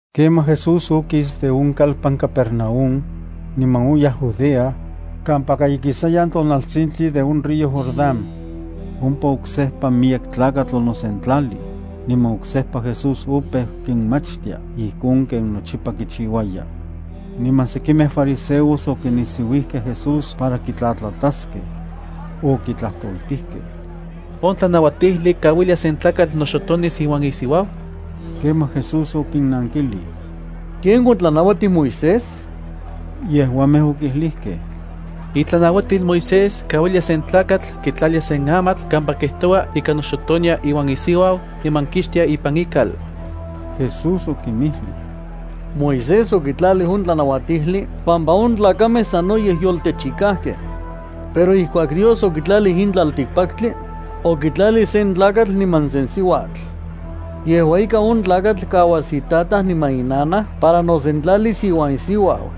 Kemaj Jesús okis on kalpan Cafarnaúm, niman oyaj Judea, kampaka ikisayan tonaltsintli on río Jordán. Ompa oksejpa miyek tlakatl onosentlalij, niman oksejpa Jesús opeu kinmachtia ijkon ken nochipa kichiuaya. Niman sekimej fariseos okinisiuijkej Jesús para kitlatlataskej. Okitlajtoltijkej: —¿On tlanauatijli kauilia sen tlakatl noxotonis iuan isiuau? Kemaj Jesús okinnankilij: —¿Ken otlanauatij Moisés? Yejuamej okijlijkej: —Itlanauatil Moisés kauilia sen tlakatl kitlalia sen amatl kampa kijtoua ika noxotonia iuan isiuau niman kixtia ipan ikal. Jesús okinmijlij: —Moisés okitlalij on tlanauatijli pampa on tlakamej sanoyej yoltechikajkej. Pero ijkuak Dios okitlalij in tlaltikpaktli, okitlalij sen tlakatl niman sen siuatl. Yejua ika on tlakatl kauas itataj niman inanaj para nosentlalis iuan isiuau.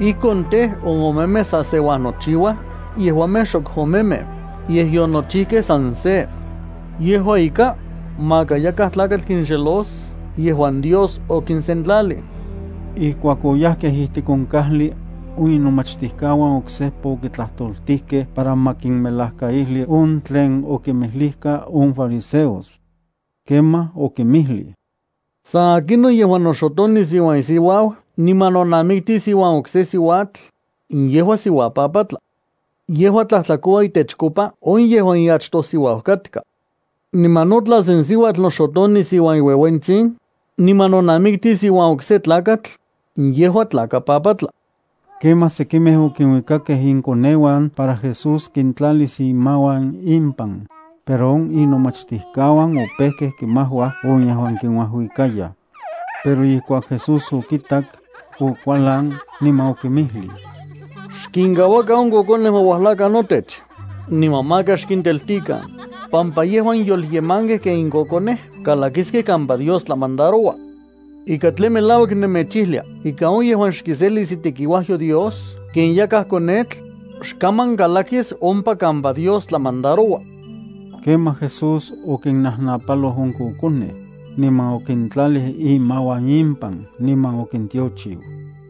Ijkon tej, on omemej sa se uajnochiuaj, yejuamej xok omemej, yej yonochijkej san se. Yejua ika, maka yakaj tlakatl kinxelos yejuan Dios okinsentlalij. Ijkuak oyajkej ijtik on kajli, on inomachtijkauan oksejpa okitlajtoltijkej para ma kinmelajkaijli on tlen okinmijlijka on fariseos. Kemaj okinmijlij: —San akinon yejuan noxotonis iuan isiuau niman nonamiktis iuan okse siuatl, yejua siuapapatla. Yejua tlajtlakoua itechkopa on yejuan iachtojsiuau katka. Niman no tla sen siuatl noxotonis iuan iueuentsin, niman nonamiktis iuan okse tlakatl, yejua tlakapapatla. Kemaj sekimej okinuikakej inkoneuan para Jesús kintlalis imauan impan, pero on inomachtijkauan opejkej kimajuaj on yejuan kinuajuikayaj. Pero ijkuak Jesús okitak, okualan, niman okinmijlij: —Xkinkauakan on kokonej ma uajlakan notech, niman maka xkinteltikan, pampa yejuan yolyemankej ken in kokonej kalakiskej ne kampa Dios tlamandaroua. Ika tlen melauak nemechijlia ika on yejuan xkiselis itekiuajyo Dios ken yakaj konetl, xkaman kalakis ompa kampa Dios tlamandaroua. Kemaj Jesús okinnajnapaloj on kokonej, niman okintlalij imauan impan, niman okintiochiu.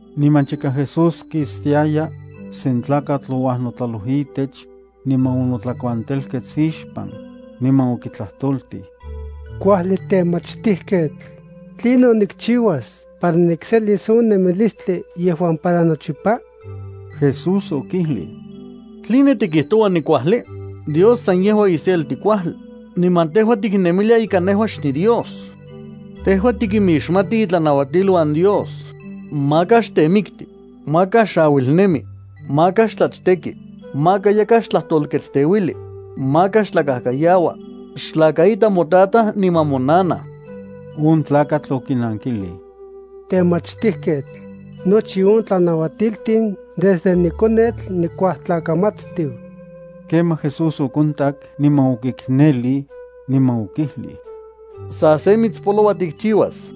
Niman chika Jesús kistiaya, sen tlakatl ouajnotlaloj itech, niman onotlakuantelkets ixpan, niman okitlajtoltij: —Kuajli temachtijketl, ¿tlinon nikchiuas para nikselis on nemilistli yejuan para nochipa? Jesús okijlij: —¿Tline tikijtoua nikuajli? Dios san yejua iselti kuajli, niman tejua tiknemilia ika nejua xniDios. Tejua tikimixmati itlanauatiluan Dios: “Maka xtemikti, maka xauilnemi, maka xtlachteki, maka yakaj xtlajtolketsteuili, maka xtlakajkayaua, xtlakaita motataj niman monanaj.” On tlakatl okinankilij: —Temachtijketl, nochi on tlanauatiltin desde nikonetl nikuajtlakamatstiu. Kemaj Jesús okontak, niman okiknelij, niman okijlij: —Sa se mitspoloua tikchiuas.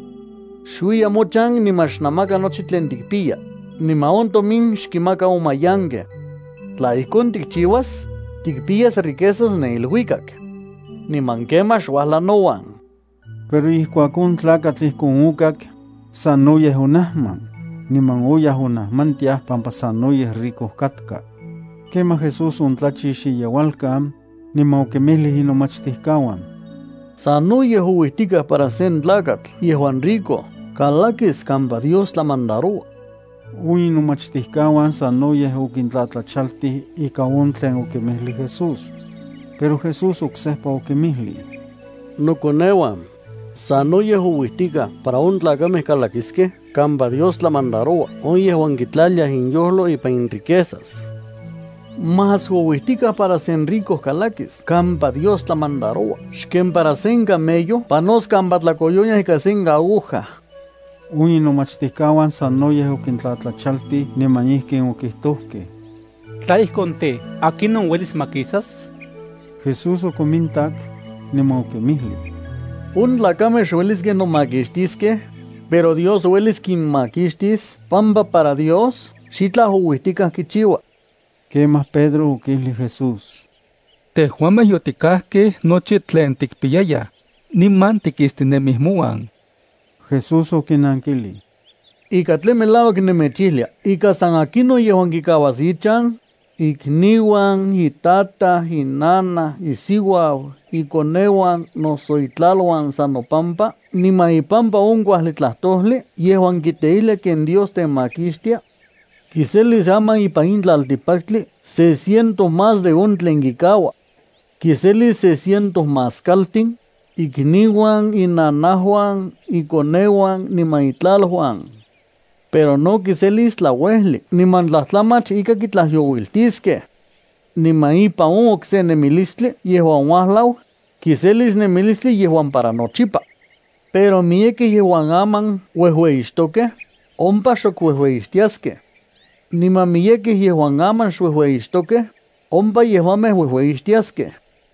Xuiya mochan niman xnamaka nochi tlen tikpiya, niman on tomin xkinmaka on mayankej. Tla ijkon tikchiuas, tikpiyas riquezas ne iluikak. Niman kemaj xuajla nouan. Pero ijkuak on tlakatl ijkon okak, sanoyej onajman, niman oyaj onajmantiaj pampa sanoyej rico katka. Kemaj Jesús ontlatlachix iyeualkan, niman okinmijlij inomachtijkauan: —Sanoyej ouijtikaj para sen tlakatl yejuan rico kalakis kampa Dios tlamandaroua. On inomachtijkauan sanoyej okintlatlachaltij ika on tlen okinmijlij Jesús. Pero Jesús oksejpa okinmijlij: —Nokoneuan, sanoyej ouijtikaj para on tlakamej kalakiskej kampa Dios tlamandaroua on yejuan kitlaliaj inyojlo ipan inriquezas. Más ouijtikaj para sen rico kalakis kampa Dios tlamandaroua xken para sen camello panos kampa tlakoyonia ikan sen aguja. On inomachtijkauan sanoyej okintlatlachaltij niman ijkin okijtojkej: —Tla ijkon tej, ¿akinon uelis makisas? Jesús okonmintak, niman okinmijlij: —On tlakamej xueliskej nomakixtiskej, pero Dios uelis kinmakixtis pampa para Dios xitlaj ouijtikaj kichiua. Kemaj Pedro okijlij Jesús: —Tejuamej yotikajkej nochi tlen tikpiyayaj, niman tikistinemij mouan. Jesús okinankilij: —Ika tlen melauak nemechijlia ika san akinon yejuan kikauas ichan, ikniuan, itataj, inanaj, isiuau, ikoneuan, noso itlaluan, san nopampa niman ipampa on kuajli tlajtojli yejuan kiteijlia ken Dios temakixtia, kiselis aman ipan in tlaltikpaktli se ciento más de on tlen kikaua. Kiselis se ciento más kaltin, ikniuan, inanajuan, ikoneuan niman itlaluan. Pero no kiselis tlauejli niman tlajtlamach ika kitlajyouiltiskej. Niman ipan on okse nemilistli yejuan uajlau, kiselis nemilistli yejuan para nochipa. Pero miyekej yejuan aman uejueyixtokej, ompa xok uejueyixtiaskej. Niman miyekej yejuan aman xuejueyixtokej, ompa yejuamej uejueyixtiaskej.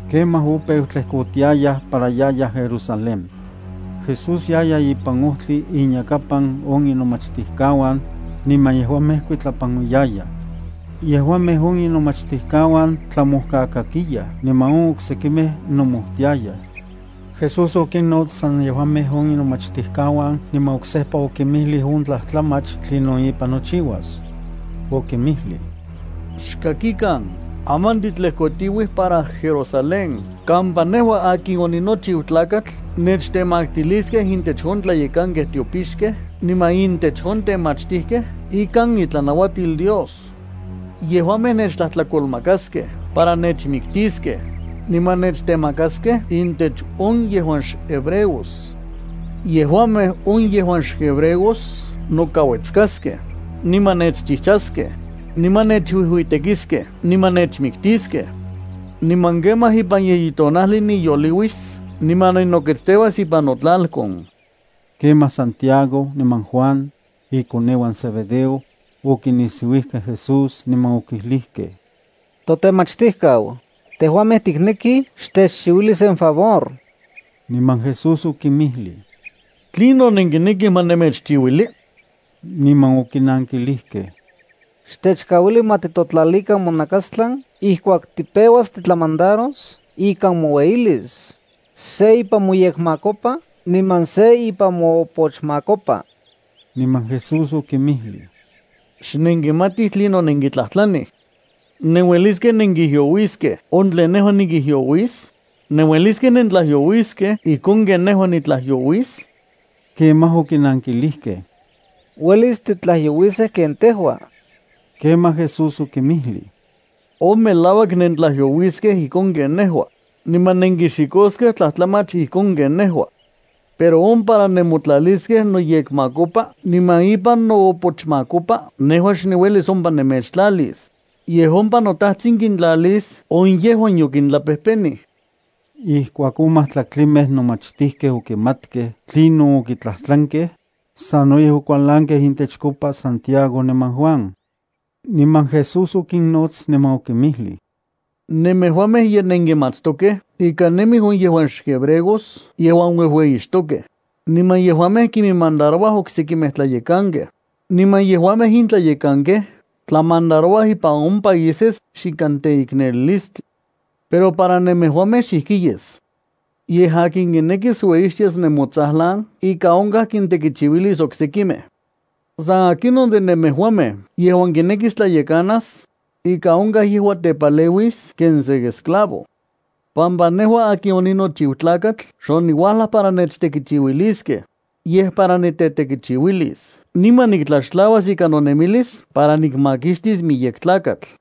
Kemaj opeu tlejkotiayaj para yayaj Jerusalén. Jesús yaya ipan ojtli inyakapan on inomachtijkauan, niman yejuamej kuitlapanuiyayaj. Yejuamej on inomachtijkauan tlamojkakakiyaj niman on oksekimej nomojtiayaj. Jesús okinnots san yejuamej on inomachtijkauan niman oksejpa okinmijlij on tlajtlamach tlinon ipan nochiuas. Okinmijlij: —Xkakikan. Aman titlejkotiuij para Jerusalén kampa nejua akin oninochiu Tlakatl nechtemaktiliskej intech on tlayekankej tiopixkej niman intech on temachtijkej ikan itlanuatil Dios. Yejuamej nechtlajtlakolmakaskej para nechmiktiskej, niman nechtemakaskej intech on yejuan xhebreos. Yejuamej on yejuan xhebreos noka uetskaskej, niman nechchijchaskej, niman nechuijuitekiskej niman nechmiktiskej. Niman kemaj ipan yeyi tonajli niyoliuis niman ninoketsteuas ipan notlalkon. Kemaj Santiago niman Juan, ikoneuan Zebedeo, okinisiuijkej Jesús, niman okijlijkej: —Totemachtijkau, tejuamej tiknekij xtechchiuili sen favor. Niman Jesús okinmijlij: —¿Tlinon nenkinekij ma nemechchiuili? Niman okinankilijkej: —Xtechkauili ma titotlalikan monakastlan ijkuak tipeuas titlamandaros ikan moueyilis, se ipan moyekmakopa niman se ipan moopochmakopa. Niman Jesús okinmijlij: —Xnenkimatij tlinon nenkitlajtlanij. ¿Nenueliskej nenkijyouiskej on tlen nejua nikijyouis? ¿Nenueliskej nentlajyouiskej ijkon ken nejua nitlajyouis? Kemaj okinankilijkej: —Uelis titlajyouiskej ken tejua. Kemaj Jesús okinmijlij: —On melauak, nentlajyouiskej ijkon ken nejua, niman nenkixikoskej tlajtlamach ijkon ken nejua. Pero on para nemotlaliskej noyekmakopa niman ipan noopochmakopa nejua xniuelis ompa nemechtlalis, yej ompa noTajtsin kintlalis on yejuan yokintlapejpenij. Ijkuak on majtlaktlimej nomachtijkej okimatkej tlinon okitlajtlankej, sanoyej okualankej intechkopa Santiago niman Juan. Niman Jesús okinnots niman okinmijlij: —Nemejuamej ye nenkimatstokej ika nemij on yejuan xhebreos yejuan uejueyixtokej, niman yejuamej kiminmandarouaj oksekimej tlayekankej, niman yejuamej in tlayekankej tlamandarouaj ipan on países xikan teiknelilistli. Pero para nemejuamej xijki yes. Yej akin kinekis ueyixtias nemotsajlan ika onkaj kintekichiuilis oksekimej. San akinon de nemejuamej yejuan kinekis tlayekanas, ika onkaj yejua tepaleuis ken sen esclavo. Pampa nejua akin oninochiu Tlakatl xoniuajlaj para nechtekichiuiliskej, yej para nitetekichiuilis niman niktlaxtlauas ika nonemilis para nikmakixtis miyek tlakatl.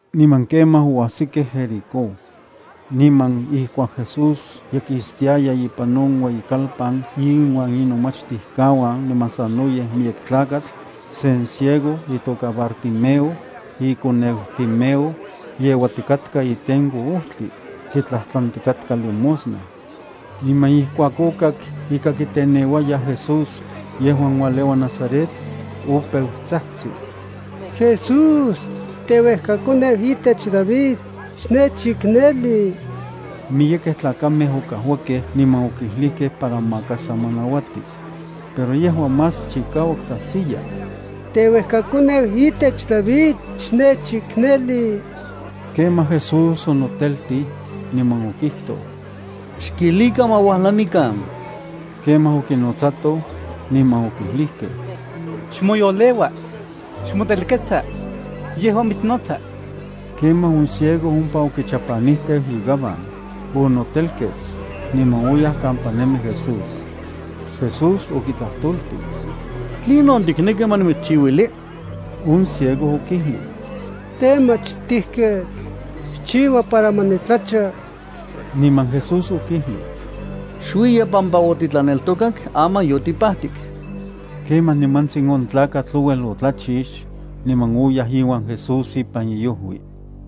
Niman kemaj oajsikej Jericó. Niman ijkuak Jesús ye kistiaya ipan on ueyikalpan inuan inomachtijkauan niman sanoyej miyek tlakatl, sen ciego, itoka Bartimeo, ikoneu Timeo, yeuatikatka itenko ojtli. Kitlajtlantikatka limosna. Niman ijkuak okak ika kiteneuayaj Jesús yejuan ualeua Nazaret, opeu tsajtsi: —¡Jesús, teuejkakoneu itech David, xnechikneli! Miyekej tlakamej okajuakej niman okijlijkej para maka sa ma nauati. Pero yejua más chikauak tsajtsiya: —¡Teuejkakoneu itech David, xnechikneli! Kemaj Jesús onoteltij, niman okijtoj: —Xkijlikan ma uajla nikan. Kemaj okinotsatoj, niman okijlijkej: —Xmoyoleua. Xmotelketsa. Yejua mitsnotsa. Kemaj on ciego ompa okichapanijteu igaban, onotelkets, niman oyaj kampa nemi Jesús. Jesús okitlajtoltij: —¿Tlinon tikneki ma nimitschiuili? On ciego okijlij: —Temachtijketl, xchiua para ma nitlacha. Niman Jesús okijlij: —Xuiya. Pampa otitlaneltokak, aman yotipajtik. Kemaj nimantsin on tlakatl ouel otlachix, niman oyaj iuan Jesús ipan iojui.